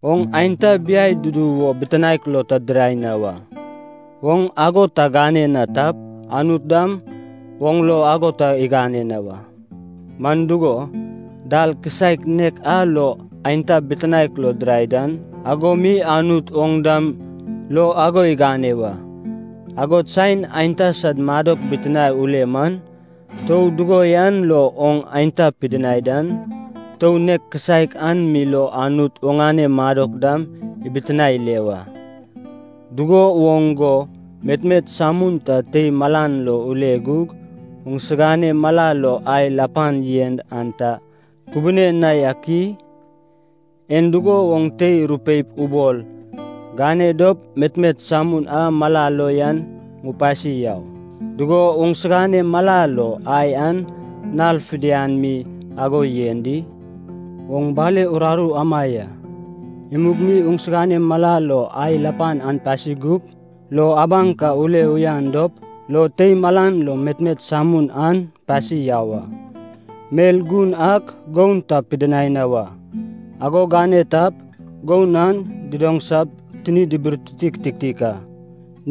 “Oŋ aenta biai dudu wo bitinaek lo ta dirai na wa. Oŋ ago ta gane na tap, Anut dam oŋ lo ago ta igane na wa. Man dugo, dal kisaek nek a lo, aenta bitinaek lo dirai dan, ago mi Anut oŋ dam lo ago igane wa. Agod saen aenta sad madok bitinae ule man, tou dugo yan lo oŋ aenta pidinai dan, tou nek kisaek an mi lo Anut oŋane madok dam ibitinae ile wa. Dugo woŋ go metmet samun ta tei malan lo ule gug oŋsigane mala lo ai lapan yen an ta kubiani na yak i? En dugo woŋ tei rupeip ubol, ‘Gane dop metmet samun a mala lo yan ŋupasi yau,’ dugo oŋsigane mala lo ai an nal fidian mi ago yen di? Oŋ bale uraru ama ya, imug mi sigane mala lo ai lapan an pasi gup, lo abaŋ ka ule uyanan dop lo tei malan lo metmet samun an pasi yau a. “Mel gun ak goun ta pidinai na wa. Ago gane tap, goun an didaŋsap tini diburtiti kitiktik a.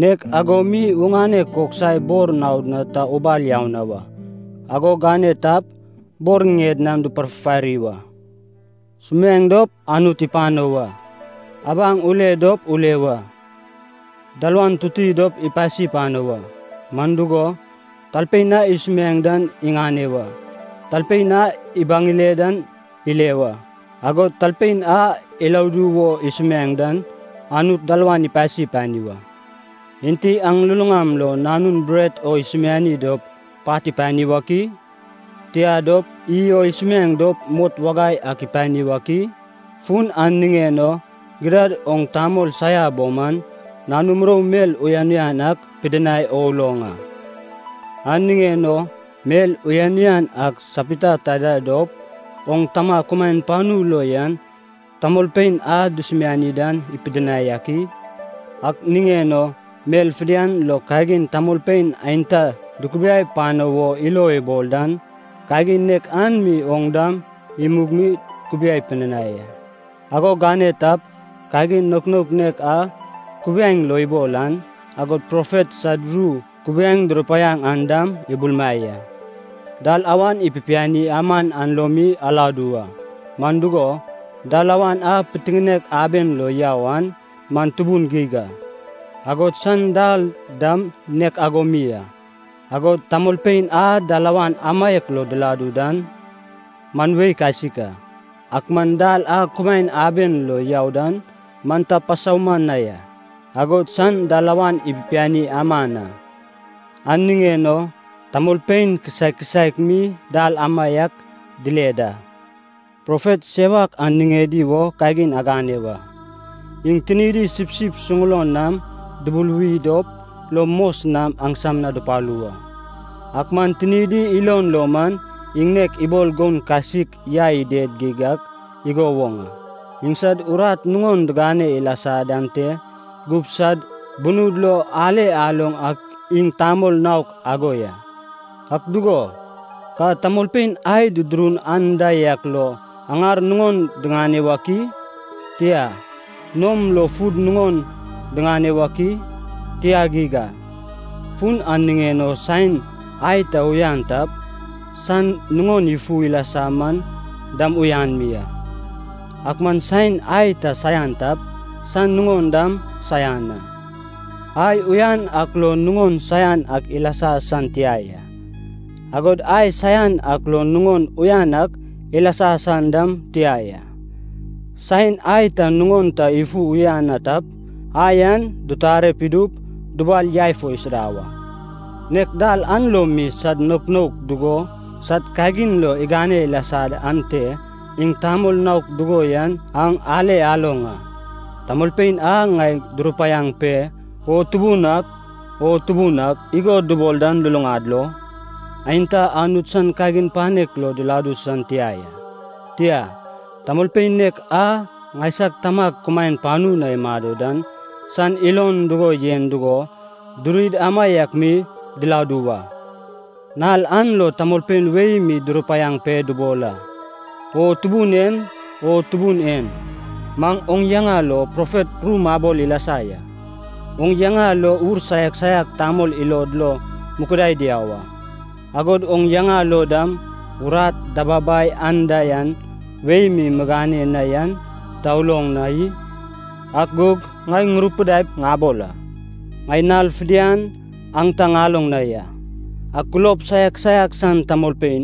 Nek ago mi oŋane koksai bor naod na ta ubal na wa. Ago gane tap, bor ŋied nam duparfufari wa. “Sumiaeŋ dop Anut ipano wa, abaŋ ule dop ule wa. Dalawan tuti dop ipasi pano wa. Man dugo, talpein a isumiaeŋ dan iŋane wa, talpein a ibaŋ ile dan ile wa, agod talpein a iladu wo isumiaeŋ dan, Anut dalawan ipasi pani wa. “Enti aŋ luluŋam lo nanun bret o isumiaeŋ dop pat ipani wak i? Tia dop, iy o isumiaeŋ dop mot wagai ak ipani wak i? Fun an niŋen o gidad oŋ tamol saia bo man, nanu murou mel uyan uyan ak pidinai o uloŋ a. An niŋen o mel uyan uyan ak sapita taida dop oŋ Tama kumaen panu lo yan tamolpein a dusumiani dan ipidinai ak i? Ak niŋen o mel fidian lo kagin tamolpein aenta dukubiai pano wo ilo ibol dan, kagin nek an mi oŋ dam imug mi kubiai pidinai a. Ago agane tap, kagin naok naok nek a kubiaeŋ lo ibol an, agod profet sad ru kubiaeŋ durupaiaŋ an dam ibulumai a. “Dalawan ipipiani aman an lo mi aladu wa. Man dugo, dalawan a pitiŋinek aben lo yau an man tubun geig a, agod san dal dam nek ago mi a, agod tamolpein a dalawan amaiak lo diladu dan man wei kasik a. Ak man dal a kumaen aben lo yau dan man ta pasauman na ya, agod san dalawan ipipiani aman a. An niŋen o tamolpein kisaek kisaek mi dal amaiak dile da. “Profet sewak an niŋedi wo kagin agane wa. Iŋ tinidi sipsip suŋulon nam dubuluwi dop lo mos nam aŋsam na dupalu wa, ak man tinidi ilon lo man iŋ nek ibol goun kasik yai ided geig ak igo woŋ a. Iŋsad urat nuŋon digane ilasa dan te gup sad bunud lo ale aloŋ ak iŋ tamol naok ago ya. Ak dugo, ka tamolpein ai dudurun anda yak lo aŋar nuŋon diŋane wak i? Tia, nom lo fud nuŋon diŋane wak i? Tia geig a. Fun an niŋen o saen ai ta uyan tap, san nuŋon ifu ilasa man dam uyan mi a. Ak man saen ai ta saian tap, san nuŋon dam saian a. Ai uyan ak lo nuŋon saian ak ilasa san tia ya, agod ai saian ak lo nuŋon uyan ak ilasa san dam tia ya. Saen ai ta nuŋon ta ifu uyan na tap, ai an ditare idup dubal yai fo isuda wa. Nek dal an lo mi sad naok naok dugo sad kagin lo igane ilasa dan te, iŋ tamol naok dugo yan aŋ ale aloŋ a. “Tamolpein a ŋai durupaiag pe ‘O Tubun ak, O Tubun ak’ igo dubol dan luluŋad lo, aenta Anut san kagin panek lo diladu san tia ya. Tia, tamolpein nek a ŋaisag Tamag kumaen panu na imado dan san ilon dugo yen dugo durid amaiak mi diladu wa. Nal an lo tamolpein wei mi durupaiag pe dubol a, ‘O Tubun en, O Tubun en, maŋ oŋ yaŋa lo profet ru mabol ilasa ya, oŋ yaŋa lo ur saiak saiak tamol ilod lo mukudai diau a, agod oŋ yaŋa lo dam urat dababai anda yan wei mi migane na yan ta uloŋ na i?’ Ak gug ŋai ŋurupidaip ŋabol a, ‘Ŋai nal fidian aŋ ta ŋaloŋ na ya. Aŋ kulob saiak saiak san tamolpein,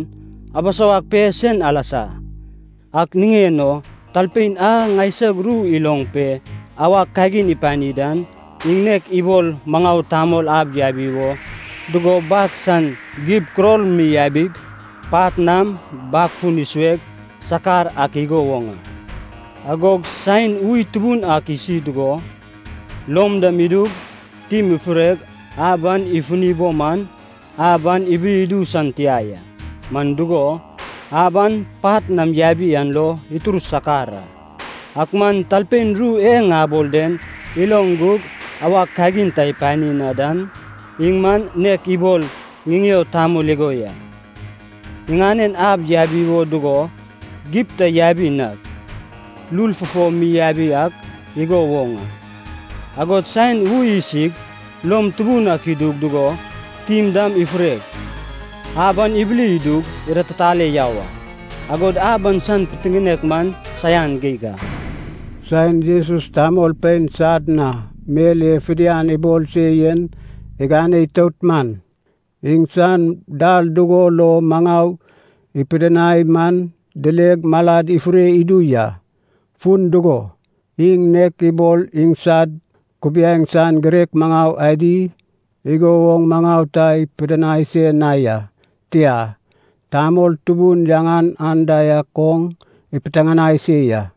abisawag pe sen alasa!’ “Ak niŋen o talpein a ŋaisag ru iloŋ pe awag kagin ipani dan, iŋ nek ibol maŋau tamol ab yabi wo dugo bag san gib kuror mi yabig, pat nam bag fun isueg sakar ak igo woŋ a. Agog saen ui tubun ak isi dugo, lom dam idug tim ifureg ab an ifuni bo man, ab an ibili idu san tia ya. Man dugo, ab an pat nam yabi an lo itur sakar a. Ak man talpein ru e ŋabol den iloŋ gug awag kagin ta ipani na dan, iŋ man nek ibol ŋiŋeo tamol igo ya, iŋanen ab yabi wo dugo gib ta yabi nag, lul fufo mi yabi ak igo woŋ a. Agod saen ui isig lom tubun ak idu dugo tim dam ifureg, ab an ibili idug iratitale yau a. Agod ab an san pitiŋinek man saian geig a.” Saen Jesus tamolpein sad na mel e fidian ibol se yen igane itout man, iŋsan dal dugo lo maŋau ipidinai man dileg maladi ifure idu ya. Fun dugo, iŋ nek ibol iŋsad kubiaeŋ san girek maŋau adi igo woŋ maŋau ta ipidinai se na ya, tia, tamol tubun yaŋan anda yak oŋ ipiteŋanai se ya.